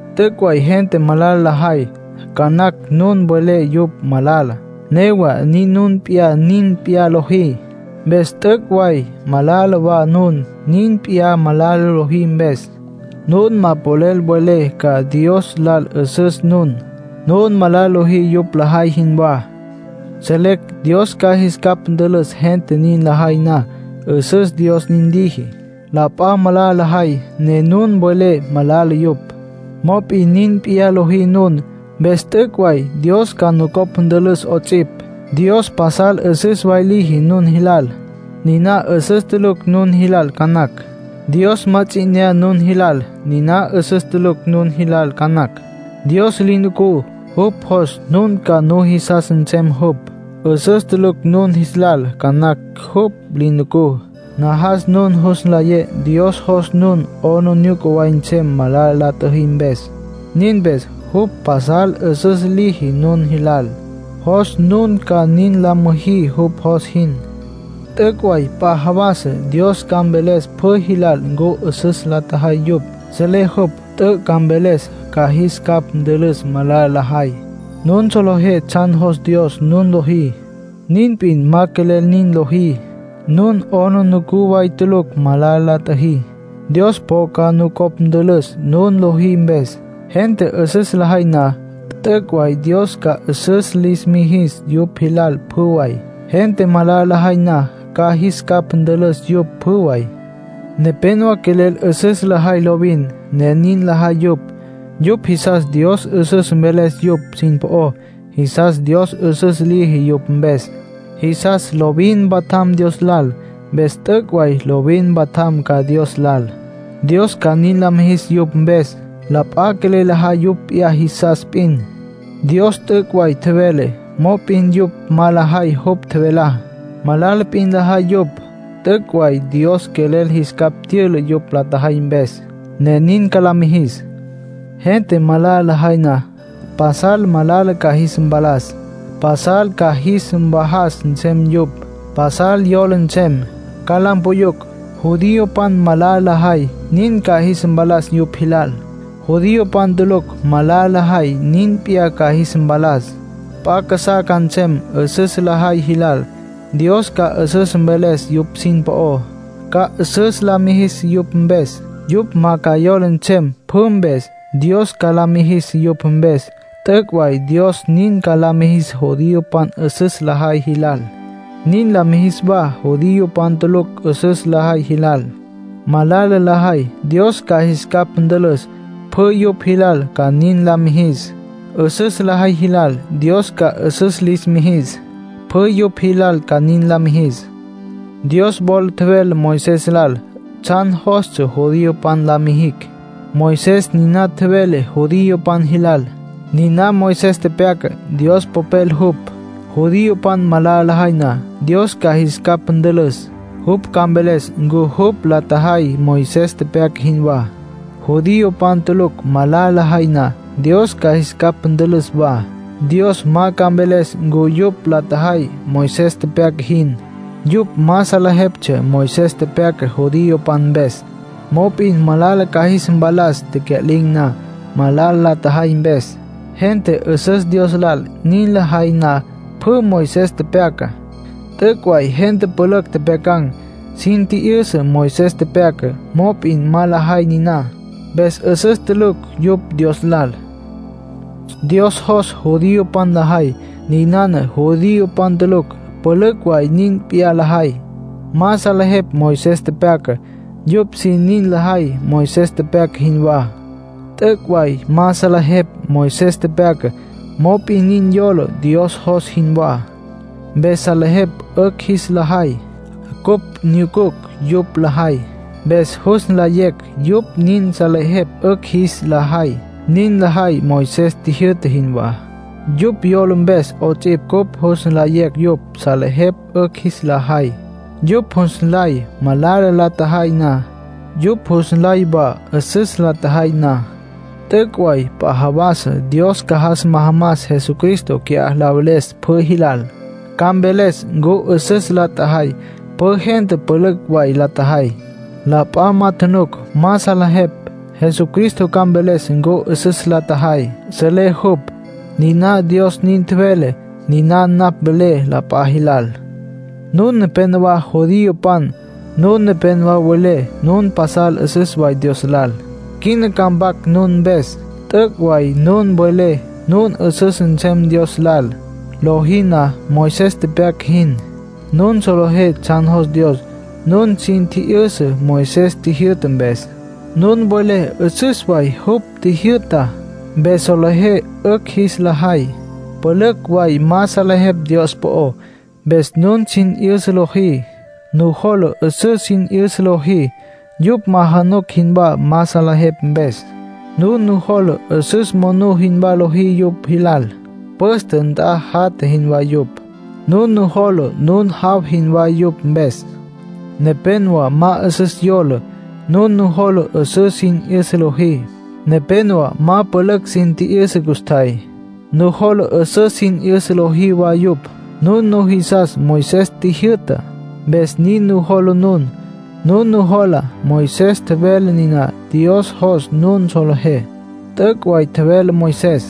T'üc' way gente malala lajay. Ca nacj nun welé yupj malala. Newa nin nun p'iyá nin p'iyá lojí. Mpes t'üc' way malala wa nun, nin p'iyá malala lojí mpes. Nun ma polel mvelé ca Dios lal 'üsüs nun; nun malala lojí yupj lajay jinwá. Selecj Dios ca jis capj ntülüs gente nin lajay na. 'Üsüs Dios nin liji. La p'a malala lajay, ne nun welé malala yupj. Mop'in nin p'iyá lojí nun. Mpes t'üc' way Dios ca nucopj ntülüs 'ots'ipj. Dios pasal 'üsüs way liji nun jilal. Niná 'üsüs tulucj nun jis lal ca nacj. Dios ma ts'i 'inyá nun jilal. Niná 'üsüs tulucj nun jis lal ca nacj. Dios li nucú, jupj jos nun ca nujisas nsem jupj. 'Üsüs tulucj nun jis lal ca nacj jupj li nucú. Najas nun jus nlayé Dios jos nun 'aplijila way nsem malala la tjüjí mpes, nin mpes jupj pasal 'üsüs liji nun jilal. Jos nun ca nin la müjí jupj jos jin. T'üc' way p'a jawas Dios ca mveles pjü jilal ncu 'üsüs la tjajay yupj. Selé jupj. T'üc' ca mveles. Ca jis capj ntülüs malala la jay. Nun solejé tsjan jos Dios nun lojí, nin p'in ma quelel nin lojí. Nun 'aplijila way tulucj malala la tjüjí. Dios po ca nucopj ntülüs nun lojí mpes. “Gente 'üsüs lajay na, t'üc' way Dios ca 'üsüs lis mijis yupj jilal pjü way. Gente malala lajay na, ca jis capj ntülüs yupj pjü way.” Nepénowa quelel 'üsüs lajay lovin, ne nin lajay yupj. Yupj jisas Dios 'üsüs mveles yupj sin po'ó. Jisas Dios 'üsüs liji yupj mpes. Jisas lovin mpatjam Dios lal. Mpes t'üc' way lovin mpatjam ca Dios lal, Dios ca nin la mijis yupj mpes. La p'a quelel lajay yupj p'iyá jisas p'in. Dios t'üc' way tjevele, mop'in yupj ma lajay jupj tjevelá. Malala p'in lajay yupj. T'üc' way Dios quelel jis capj tyüla yupj la jay mpes, ne nin ca la mijis. Gente malala lajay na, pasal malala ca jis mpalas. Pasal ca jis mvajas nsem yupj. Pasal yola nsem, ca la mpuyucj. Judiopan malala lajay, nin ca jis mpalas yupj jilal. Judiopan tulucj malala lajay, nin p'iyá ca jis mpalas. P'a casá ca nsem 'üsüs lajay jilal; Dios ca 'üsüs mveles yupj sin po'ó. Ca 'üsüs la mijis yupj mpes. Yupj ma ca yola nsem pjü mpes, Dios ca la mijis yupj mpes. T'üc' way Dios nin ca la mijis judiopan 'üsüs lajay jilal. Nin la mijis wa judiopan tulucj 'üsüs lajay jilal. Malala lajay, Dios ca jis capj ntülüs. Pjü yupj jilal ca nin la mijis. 'Üsüs lajay jilal, Dios ca 'üsüs lis mijis. Pjü yupj jilal ca nin la mijis. Dios wola tjevele Moisés lal tsjan jostsja judiopan la mijicj. Moisés niná tjevele judiopan jilal. Niná Moisés tepyaca, Dios Popel jupj. Judiopan malala lajay na, Dios ca jis capj ntülüs. Jupj ca mveles ncu yupj la tjajay Moisés tepyaca jinwá. Judiopan tulucj malala lajay na, Dios ca jis capj ntülüs wa. Dios ma ca mveles ncu yupj la tjajay Moisés tepyaca jin; yupj ma salejeptsja Moisés tepyaca judiopan mpes. Mop'in malala ca jis mpalas tecya'lin̈ na, malala la tjajay mpes. Gente 'üsüs Dios lal nin lajay na pjü Moisés tepyacá. T'üc' way gente pülücj tjepjyacan̈, sin tji'yüsa Moisés tepyacá; mop'in ma lajay niná. Mpes 'üsüs tulucj yupj Dios lal. Dios jos judiopan lajay, ninana judiopan tulucj pülücj way nin p'iyá lajay. Ma salejepj Moisés tepyacá. Yupj sin nin lajay Moisés tepyaca jinwá. T'üc' way ma salejepj Moisés tepyacá, mop'in nin yola Dios jos jinwá. Mpes salejepj 'ücj jis la jay. Cupj nyucucj yupj lajay, mpes jus nlayecj yupj nin salejepj 'ücj jis la jay. Nin lajay Moisés tjijyü'ta jinwá. Yupj yola mpes 'ots'ipj cupj jus nlayecj yupj salejepj 'ücj jis la jay. Yupj jus nlay malala la tjajay na. Yupj jus nlay wa 'üsüs la tjajay na. T'üc' way p'a jawas Dios ca jas majamas Jesucristo qui'á la veles pjü jilal. Ca mveles ncu 'üsüs la tjajay. Pjü gente pülücj way la tjajay, la p'a ma tjunuc, ma salejepj. Jesucristo ca mveles ncu 'üsüs la tjajay. Selé jupj. Niná Dios nin tjevele, niná napj velé la p'a jilal. Nun nepénowa judiopan. Nun nepénowa welé nun pasal 'üsüs way Dios lal. Quina ca mpac nun mpes. T'üc' way nun welé nun 'üsüs nsem Dios lal, lojí na Moisés tepyaca jin. Nun solejé tsjan jos Dios. Nun sin tji'yüsa Moisés tjijyü'ta mpes. Nun welé 'üsüs way jupj tjijyü'tá. Mpes solejé 'ücj jis la jay. Pülücj way ma salejepj Dios po'ó, mpes nun sin 'yüsa lojí. Nujola 'üsüs sin 'yüsa lojí. Yupj ma januc jinwá ma salejepj mpes. Nun nujola 'üsüs monú jinwá lojí yupj jilal. Püste nt'a jatja jinwá yupj. Nun nujola nun jaw jinwá yupj mpes. Nepénowa ma 'üsüs yola. Nun nujola 'üsüs sin 'yüsa lojí. Nepénowa ma pülücj sin tji'yüsa custjay. Nujola 'üsüs sin 'yüsa lojí wa yupj. Nun nujisas Moisés tjijyü'tá, mpes nin nujola nun. Nun nujola Moisés tjevele niná Dios jos nun solejé. T'üc' way tjevele Moisés.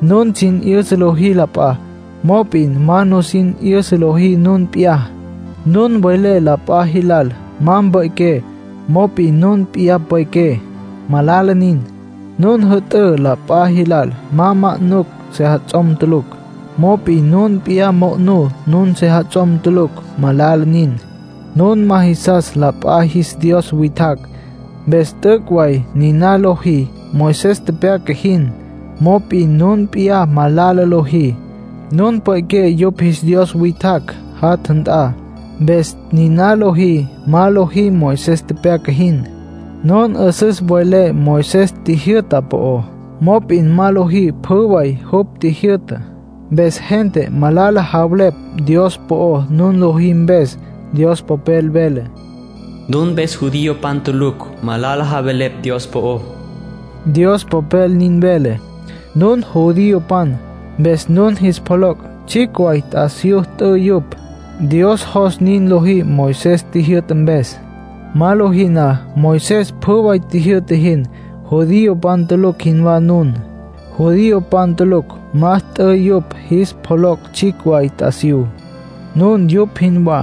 Nun sin 'yüsa lojí la p'a; mop'in ma nusin 'yüsa lojí nun p'iyá. Nun welé la p'a jilal ma mpequen̈; mop'in nun p'iyá pwe'qué. Malala nin. Nun jü'tǘ la p'a jilal ma ma'nucj sejats'om tulucj; mop'in nun p'iyá mo'nú nun sejats'om tulucj. Malala nin. Nun ma jisas la p'a jis dios witjacj. Mpes t'üc' way niná lojí Moisés tepyaca jin. Mop'in nun p'iyá malala lojí; nun pwe'qué yupj jis dios witjacj jatja nt'a. Mpes niná lojí ma lojí Moisés tepyaca jin. Nun 'üsüs welé Moisés tjijyü'ta po'ó; mop'in ma lojí pjü way jupj tjijyü'tá. Mpes gente malala javelepj Dios po'ó nun lojí mpes. Dios Popel vele: “Nun mpes judiopan tulucj malala javelepj Dios po'ó”, Dios Popel nin vele. Nun judiopan, mpes nun jis pjoloc' tsjicj way t'asiyú t'ü yupj. Dios jos nin lojí Moisés tjijyü'ta mpes. Ma lojí na Moisés pjü way tjijyü'ta jin, judiopan tulucj jinwá nun. Judiopan tulucj ma t'ü yupj jis pjoloc' tsjicj way t'asiyú. Nun yupj jinwá.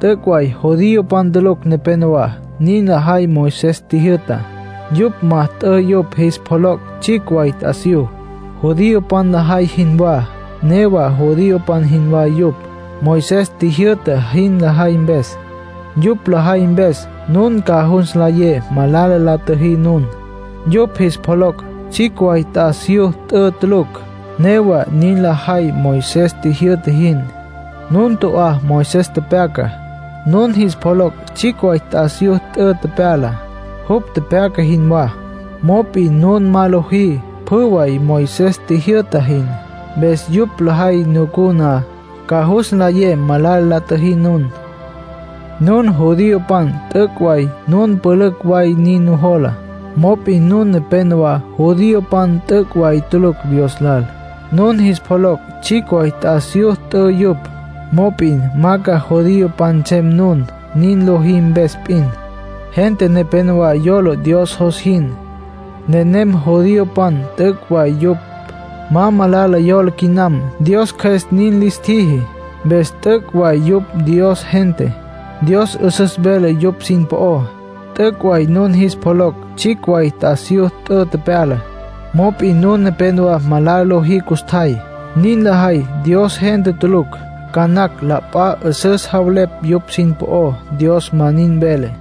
T'üc' way judiopan tulucj nepénowa nin lajay Moisés tjijyü'tá. Yupj ma t'ü yupj jis pjoloc' tsjicj way t'asiyú, judiopan lajay jinwá; newa judiopan jinwá yupj, Moisés tjijyü'ta jin lajay mpes. Yupj lajay mpes, nun ca jus nlayé malala la tjüjí nun. Yupj jis pjoloc' tsjicj way t'asiyú t'ü tulucj, newa nin lajay Moisés tjijyü'ta jin. Nun to'á Moisés tepyacá. Nun jis pjoloc' tsjicj way t'asiyú t'ü tepyala, jupj tepyaca jinwá. Mop'in nun ma lojí pjü way Moisés tjijyü'ta jin. Mpes yupj lajay nucú na, ca jus nlayé malala la tjüjí nun. Nun judiopan t'üc' way, nun pülücj way nin nujola. Mop'in nun nepénowa judiopan t'üc' way tulucj Dios lal. Nun jis pjoloc' tsjicj way t'asiyú t'ü yupj; mop'in ma ca judiopan nsem nun, nin lojí mpes p'in. Gente nepénowa yola Dios jos jin. Nenem judiopan t'üc' way yupj. Ma malala yola quinam, Dios Cjües nin lis tjiji. Mpes t'üc' way yupj Dios gente. Dios 'üsüs vele yupj sin po'ó. T'üc' way nun jis pjoloc' tsjicj way t'asiyú t'ü tepyala, mop'in nun nepénowa malala lojí custjay. Nin lajay, Dios gente tulucj. Ca nacj la p'a 'üsüs javelepj yupj sin po'ó; Dios ma nin vele.